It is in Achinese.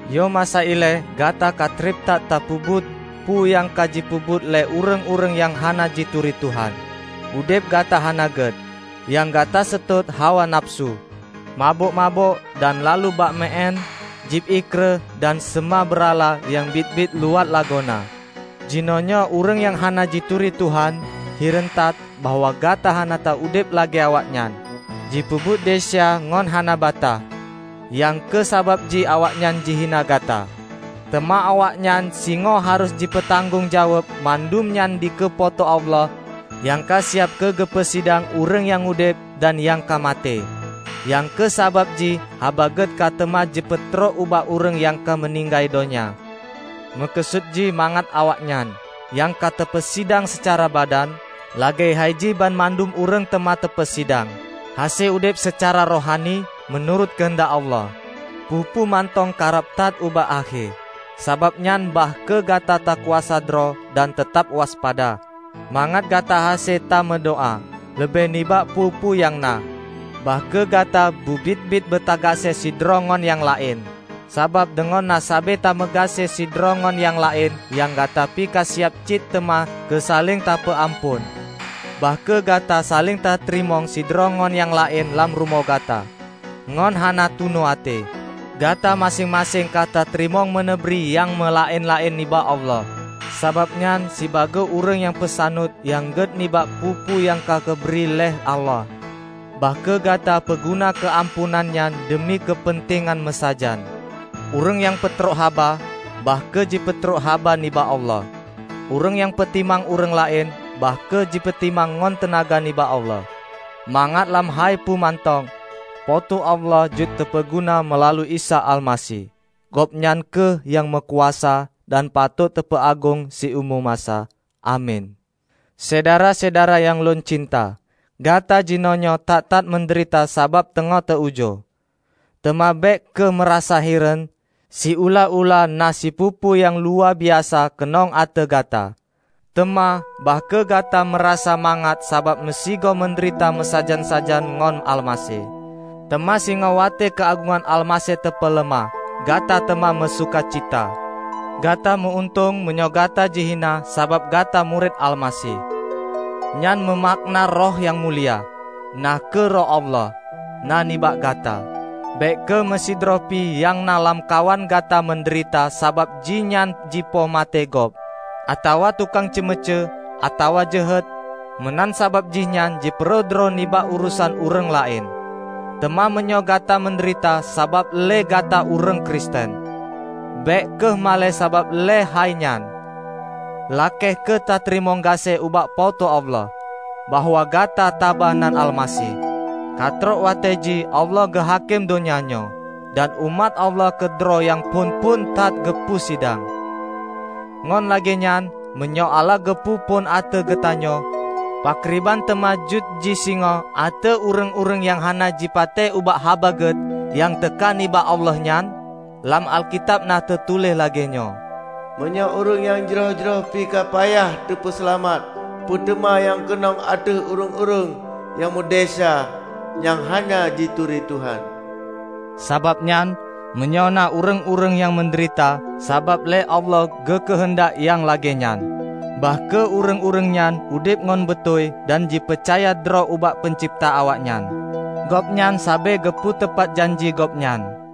Yoh masa ilée, gata ka treb that tapeubuet peue nyang ka jipeubuet lé ureuëng-ureuëng nyang hana jituri Tuhan. Udeb gata hana gét. Nyang gata seutôt hawa nafeusu, mabök-mabök dan laloe bak meu-én, jieb ié kreueh dan seumah beurala nyang biet-biet luwat lagoena. Jinoenyoe ureuëng nyang hana jituri Tuhan, hireuen that bahwa gata hana taudeb lagée awaknyan, jipeubuet desya ngon hana bataih. Nyang kheueh sabab jih awaknyan jihina gata. Teuma awaknyan singoh harôh jipeutanggong jaweueb mandum nyan dikeue Po teu Allah nyang ka siab keugeupeusidang ureuëng nyang udeb dan nyang ka maté. Nyang kheueh sabab jih Haba Gét ka teuma teupeutrok ubak ureuëng nyang ka meuninggai donya. Meukeusut jih mangat awaknyan, nyang ka teupeusidang seucara badan -- lagée hai jih banmandum ureuëng teuma teupeusidang -- hase udeb seucara rohani, meunurot keuheundak Allah. Peue-peue mantong karab that ubak akhé, sabab nyan bah kheueh gata takuasa droe dan teutab waspada, mangat gata hase ta meudoá. Leubeh nibak peue-peue nyang na, bah kheueh gata beubiet-biet beutagaséh sidroe ngon nyang laén, sabab deungon na sabe tameugaséh sidroe ngon nyang laén nyan gata pi kasiab cit teuma keu saléng tapeuamphon. Bah kheueh gata saléng tateurimong sidroe ngon nyang laén lam rumoh gata, ngon hana tunu até. Gata maséng-maséng ka tateurimong meuneubri nyang meulaén-laén nibak Allah. Sabab nyan sibagoe ureuëng nyang peusaneut nyang gét nibak peue-peue nyang ka geubri lé Allah, bah kheueh gata peuguna keumampuan nyan deumi keupeuntengan meusajan. Ureuëng nyang peutrok haba, bah kheueh jipeutrok haba nibak Allah; ureuëng nyang peutimang ureuëng laén, bah kheueh jipeutimang ngon teunaga nibak Allah, mangat lam hai peue mantong, Po teu Allah jeuet teupeuguna meulalu Isa Almaseh. Gobnyan kheueh nyang meukuasa dan patot teupeuagong siumu masa. Amin. Syedara-syedara nyang lôn cinta! Gata jinoenyoe that-that meudeurita sabab teungoh teu-ujoe. Teuma bék kheueh meurasa hireuen, siulah-ulah na sipeue-peue nyang luwabiasa keunong ateueh gata. Teuma, bah kheueh gata meurasa mangat sabab meusigoe meudeurita meusajan-sajan ngon Almaseh. Teuma singoh watée keuagongan Almaseh teupeuleumah, gata teuma meusukacita. Gata meu-untông meunyoe gata jihina sabab gata murit Almaseh. Nyan meumakna Roh nyang mulia, na kheueh Roh Allah, na nibak gata. Bék kheueh meusidroe pih nyang na lamkawan gata meudeurita sabab jihnyan jipoh maté gob, atawa tukang ceumeucue, atawa jeuhet, meunan sabab jihnyan jipeuroh droe nibak urosan ureuëng laén. Teuma meunyoe gata meudeurita sabab lé gata ureuëng Kristen, bék kheueh malée sabab lé hai nyan. Lakée kheueh teurimong gaséh ubak Po teu Allah, bahwa gata taba nan Almaseh. Ka trok watée jih Allah geuhakém donya nyoe. Dan umat Allah keudroe nyang phon-phon that geupeu sidang. Ngon lagée nyan, meunyoe Allah geupeu phon ateueh geutanyoe, pakriban teuma jeuet jih singoh ateueh ureuëng-ureuëng nyang hana jipatéh ubak Haba Gét nyang teuka nibak Allah nyan? Lam Alkitab na teutuléh lagée nyoe, "Meunyoe ureuëng nyang jroh-jroh pi ka payah teupeuseulamat, peue teuma nyang keunong ateueh ureuëng-ureuëng nyang meudesya nyang hana jituri Tuhan!" Sabab nyan, meunyoe na ureuëng-ureuëng nyang meudeurita sabab lé Allah geukeuheundak nyang lagée nyan, bah kheueh ureuëng-ureuëng nyan udeb ngon beutôi dan jipeucaya droe ubak peuncebta awaknyan. Gobnyan sabe geupeu teupat janji Gobnyan.